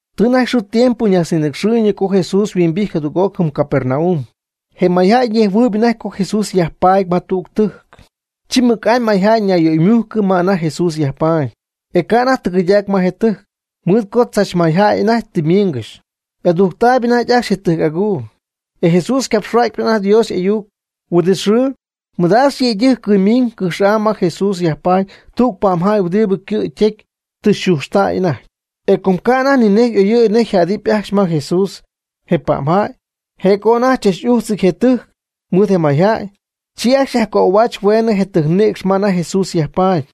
Tɨ anajty xɨɨ tiempo ñajtznïnɨcxɨɨyñɨ co Jesús yhuimbijty jadüg'oc jɨm Capernaum. Je mayjäy ñejhuɨɨyb anajty co Jesús yajpaady ma tüg tɨjc. Chi mɨc'amy mayjäy ñayyöymujcɨ ma anajty Jesús yajpaady, e ca' anajty tɨgɨydac ma je tɨjc, mɨɨd co tzach mayjäy anajty tɨ miingɨxy. Y'adujctaayb anajty ajcxy je tɨjc'aguu. E Jesús ycapxhua'xyp anajty Dios y'ayuc. Huin'it xɨɨ, mɨdaax yëydɨjc cɨymiñ cɨjx'am ma Jesús yajpaady tüg pa'mjäy huɨdibɨ ycɨ' ytecy tɨ yxujxtäy anajty. E com ca' anajty ni nej y'oyɨ̈y nej yajjädɨp ajcxy ma Jesús je pa'mjäy, je' co anajty chach újtzɨty je tɨjc mɨɨd je mayjäy, chi ajcxy yajcöhuaach hueenɨ je tɨjcnïcx ma anajty Jesús yajpaady.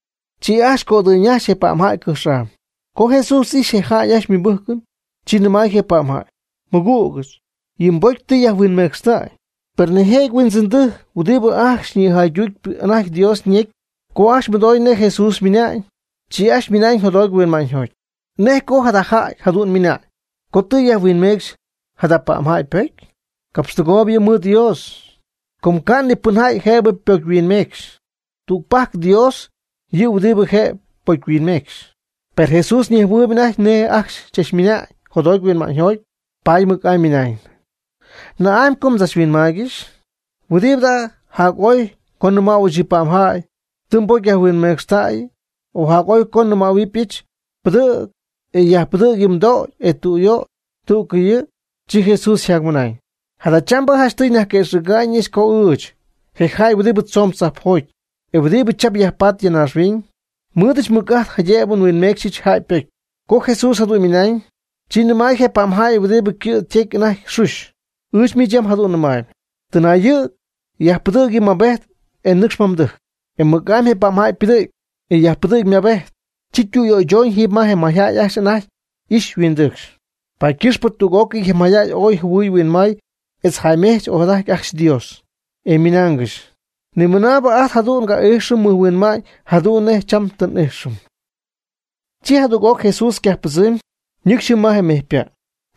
Chi ajcxy cödɨyñajxy je pa'mjäy cɨjx'am. Co Jesús ijxy je jäy ajcxy ymɨbɨ́jcɨn, chi nɨmay je pa'mjäy: ―Mɨgügɨch, yɨ mbocy tɨ yajhuinmecxtäy. Per nijëjɨty huindzɨndɨjc huɨdibɨ ajcxy nïjaydutp anajty Dios ñecy co ajcxy mɨdoy nej Jesús ymɨna'ñ, chi ajcxy ymɨna'ñ jotjoty huinma'ñyjoty: “¿Nej co jada jäy jadu'n ymɨna'ñ co tɨ yajhuinmecxy jada pa'mjäy ypocy? Capxtɨgooyb yɨ' mɨɨd Dios. Com ca' nipɨnjäy jëb ypocyhuinmecxy. Tügpajc Dios yɨ' huɨdibɨ jëb ypocyhuinmecxy.” Per Jesús ñejhuɨɨyb anajty nej je' ajcxy chachmɨna'ñ jotjoty huinma'ñyjoty, paady mɨc'amy ymɨnañ: ―¿Na'amy co mdzachhuinmaaygɨxy? ¿Huɨdibɨ jada jac'ooy co nnɨmäyɨch yɨ pa'mjäy: “Tɨ mbocy yajhuinmecxytäyɨ.” O jac'ooy co nnɨmähuɨbɨch: “Pɨdɨ̈g, e yajpɨdɨ̈g yɨ mdögy, e tüyöy?” Tú'cɨy yɨ'. Chi Jesús yjacmɨnañ: ―Jadachambɨ janchtɨy nyajquëxɨ̈ga'ñɨch co ɨɨch, je jäy huɨdib tzoon tzajpjoty, e huɨdibɨ cham yajpaady ya naaxhuiñ, nmɨɨdɨch mɨc'ajt jaydëb nhuinmecxyɨch jäy ypocy. Co Jesús jadu'n ymɨnañ, chi nɨmay je pa'mjäy huɨdibɨ ycɨ' ytecy anajty xuxy: ―Ɨɨch miich yam jadu'n nɨmäy: “Tɨnayɨ̈g, yajpɨdɨ̈g yɨ mmabejt e nɨcx ma mdɨjc.” E mɨc'amy je pa'mjäy ypɨdɨ̈gy, e yajpɨdɨ̈gy ymabejt, chi ytüyöychoñ jiiby ma je mayjäy ajcxy anajty y'ixy yhuindɨcxy. Paady ycɨxpɨ tüg'ócɨy je mayjäy ooy jɨhuɨy huinmay etz jäymejch ojadajty ajcxy Dios, ymɨnaangɨxy: ―Nimɨnaabɨ ajt jadu'n nga'íjxɨm mɨjhuinma'ñ jadu'n nej cham tɨ n'íjxɨm. Chi jadüg'oc Jesús ycajppɨdzɨmy, ñɨcxy jɨm ma mejypa'.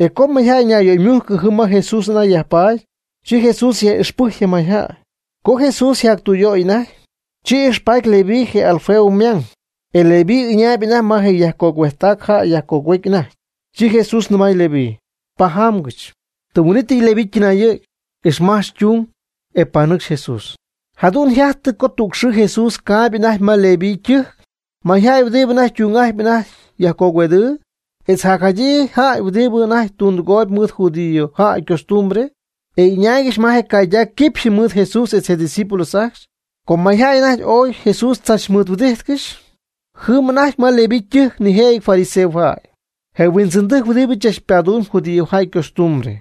E co mayjäy ñayöymujcy jɨm ma Jesús anajty yajpaady, chi Jesús yaj'ixpɨjc je mayjäy. Co Jesús yjactüyöy anajty, chi ijxpaady Leví je Alfeo ymang. E Leví ɨñaayb anajty ma je yajcogüejttac jäy yajcogüejtp anajty. Chi Jesús nɨmay Leví: ―Pajamgɨch. Tɨm huin'ítɨy Leví ytɨnayɨ̈gy, ixmajch ytung, e panɨcxy Jesús. Jadu'n yjajtɨ co tüg xɨɨ Jesús caayb anajty me Leví ytɨjc. Mayjäy huɨdibɨ ytung'ajtpy anajty yajcogüedɨɨ, etz jacjadyii jäy huɨdibɨ anajty tundɨgooyb mɨɨd judío jäy ycostumbre y'ɨñaaygɨxy ma je caydac quipxy mɨɨd Jesús etz je' ydiscípulos ajcxy. Com may jäy anajty ooy Jesús tzach mɨɨd huɨdíjtcɨxy. Jɨm anajty ma Leví ytɨjc nijëjɨty fariseojäy, je huindzɨndɨjc huɨdibɨ tzach padumb judíojäy ycostumbre.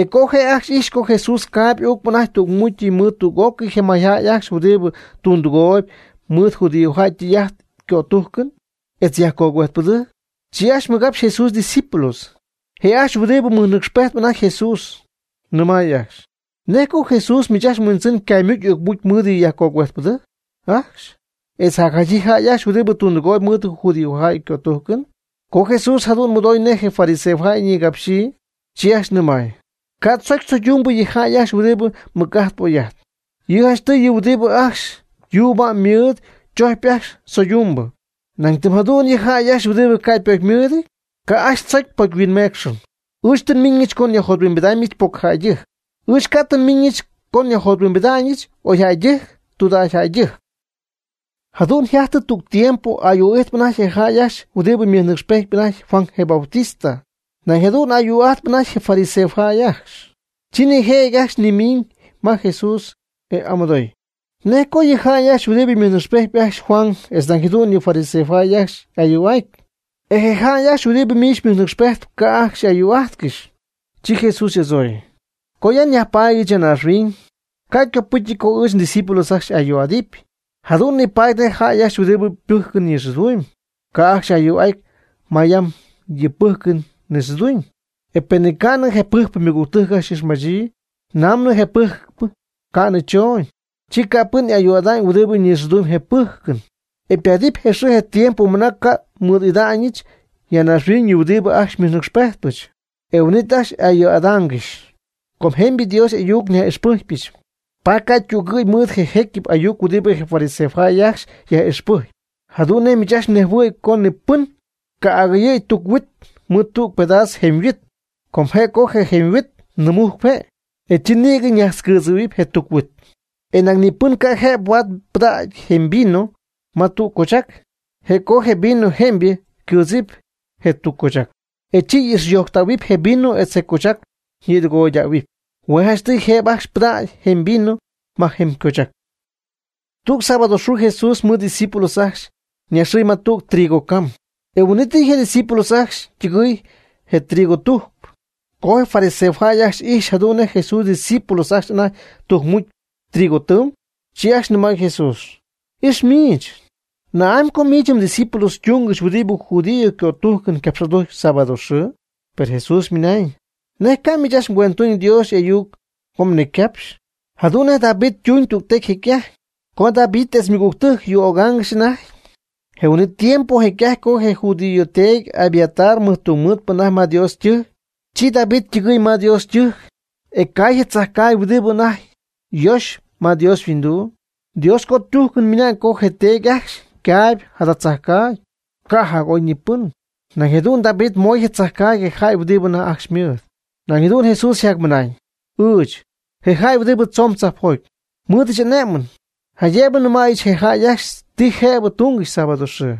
E co je' ajcxy ijxy co Jesús caayb uucp anajty tügmucy mɨɨd tüg'ócɨy je mayjäy ajcxy huɨdibɨ tundɨgooyb mɨɨd judíojäy ytɨy'ajt ycötújcɨn, etz yajcogüejtpɨdɨjc, chi ajcxy mɨgapxy Jesús ydiscípulos, je' ajcxy huɨdibɨ mɨjnɨcxpejtp anajty Jesús, nɨmay ajcxy: ―¿Nej co Jesús miich ajcxy mHuindzɨn ycaymucy y'ucmucy mɨɨd yɨ yajcogüejtpɨdɨjc ajcxy, etz jacjadyii jäy ajcxy huɨdibɨ tundɨgooyb mɨɨd judíojäy ycötújcɨn? Co Jesús jadu'n mɨdoy nej je fariseo jäy nigapxyii, chi ajcxy nɨmay: ―Ca' tzocy tzoydumbɨ yɨ jäy ajcxy huɨdibɨ mɨc'ajtp oy'ajtp. Yɨ' janchtɨy yɨ huɨdibɨ ajcxy yuuba'm ymɨɨd chojcpy ajcxy tzoydumbɨ. Nañ tɨm jadu'n yɨ jäy ajcxy huɨdibɨ ca' ypocymɨɨdɨty, ca' ajcxy tzocy pocyhuinmeecxɨn. Ɨɨch tɨ nmiñɨch co nyajjothuimbidɨpyɨch pocyjäydɨjc. Ɨɨch ca' tɨ nmiñɨch co nyajjothuimbidɨpyɨch oyjäydɨjc tudägyjäydɨjc. Jadu'n yjajtɨ tüg tiempo ayuu'ijtp anajty je jäy ajcxy huɨdibɨ mɨjnɨcxpejtp anajty Juan je Bautista. Nañ jadu'n ayuu'ajtp anajty je fariseojäy ajcxy. Chi nijëjɨty ajcxy ymiñ ma Jesús e amɨdoy: ―¿Nej co yɨ jäy ajcxy huɨdibɨ mɨjnɨcxpejtp ajcxy Juan etz nañ jadu'n yɨ fariseojäy ajcxy ayuu'ajtp ajcxy, e je jäy ajcxy huɨdib miich xymɨjnɨcxpejtp, ca' y'ayuu'ájtcɨxy? Chi Jesús y'adzooy: ―Co ya nyajpaadyɨch ya naaxhuiñ, ca' ycopɨ́cɨty co ɨɨch ndiscípulos ajcxy y'ayuu'adɨp. Jadu'n nipaady nej jäy ajcxy huɨdibɨ pɨ́jcɨn nixɨɨdumy ca' ajcxy y'ayuu'aty ma yam yɨ pɨ́jcɨn nixɨɨduñ, e penɨ ca'nɨ je pɨjcpɨ ymɨgügtɨjc y'ixmajtztäyii. Namɨ je pɨjcpɨ ca'nɨ choñ, chi ca' pɨn y'ayuu'ada'ñ huɨdibɨ nixɨɨdum je pɨ́jcɨn. E paadɨp je xɨɨ je tiempo mɨna ca' nmɨɨd'ida'ñɨch ya naaxhuiñ yɨ' huɨdibɨ ajcxy xymɨjnɨcxpejtpɨch, e huin'it ajcxy y'ayuu'adaangɨxy. Com jemybɨ Dios y'ayuc nyaj'ixpɨcpyɨch, paady ca' ytügɨ̈y mɨɨd je jécyɨp ayuc huɨdibɨ je fariseo jäy ajcxy yaj'ixpɨjcpy. Jadu'n nej miich ajcxy mnejhuɨ̈y co ni pɨn ca' agɨyɨ̈y tuc huit mɨɨd tüg pedaas jemy huit, con je' co je jemy huit nɨɨmujcp je', e chi nïgɨ najtzcɨɨdzɨ̈huɨp je tuc huit. E nañ ni pɨn ca' jëb huaad pɨdägy jemy vino ma tuc cochac. Je' co je vino jemybɨ ycɨɨdzamy je tuc cochac, e chi y'ixyojctähuɨp je vino etz je cochac ñitɨgoydähuɨp. Hue' janchtɨy jëb ajcxy pɨdacy jemy vino ma jemy cochac. Tüg sábado xɨɨ Jesús mɨɨd ydiscípulos ajcxy ñaxɨɨy ma tüg trigo cam. E huin'ítɨyɨ je ydiscípulos ajcxy ytɨgɨɨy je trigo tujcp. Co je fariseo jäy ajcxy ijxy jadu'n nej Jesús ydiscípulos ajcxy anajty tujcmujc trigo tɨɨm, chi ajcxy nɨmay Jesús: ―Ix miich. ¿Na'amy co miich mdiscípulos túngɨxy huɨdibɨ judío ycötújcɨn capx'adujcpy sábado xɨɨ? Per Jesús ymɨnañ: ―¿Nej ca'miich ajcxy mguendtuñ Dios y'ayuc co mnecycapxy, jadu'n nej David ytuñ tügtecy jecy'ajty, co David etz ymɨgügtɨjc yuu'ögaangɨxy anajty? Je huin'it tiempo jecy'ajty co je judío teedy Abiatar mɨjtungmɨɨdpɨ anajty ma Dios ytɨjc, chi David ytɨgɨy ma Dios ytɨjc, e caay je tzajcaagy huɨdibɨ tɨ anajty yoxy ma Dios yhuinduu. Dios ycötújcɨn ymɨnañ co je teedy ajcxy ycaagy'ajtpy jada tzajcaagy, ca' jac'ooyñipɨn. Nañ jadu'n David moy je tzajcaagy je jäy huɨdib anajty ajcxy ymɨɨd. Nañ jadu'n Jesús yjacmɨnañ: ―Ɨɨch, je jäy huɨdibɨ tzoon tzajpjoty, nmɨɨdɨch ané'mɨn, jaydëb nɨmäyɨch je jäy ajcxy ti jëb túngɨxy sábado xɨɨ.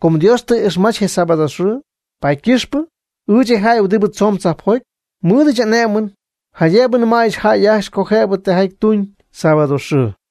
Com Dios tɨ ixmach je sábado xɨɨ, paady ycɨxpɨ, ɨɨch je jäy huɨdibɨ tzoon tzajpjoty, nmɨɨdɨch ané'mɨn jaydëb nɨmayɨch jäy ajcxy co jëb tijaty tuñ sábado xɨɨ.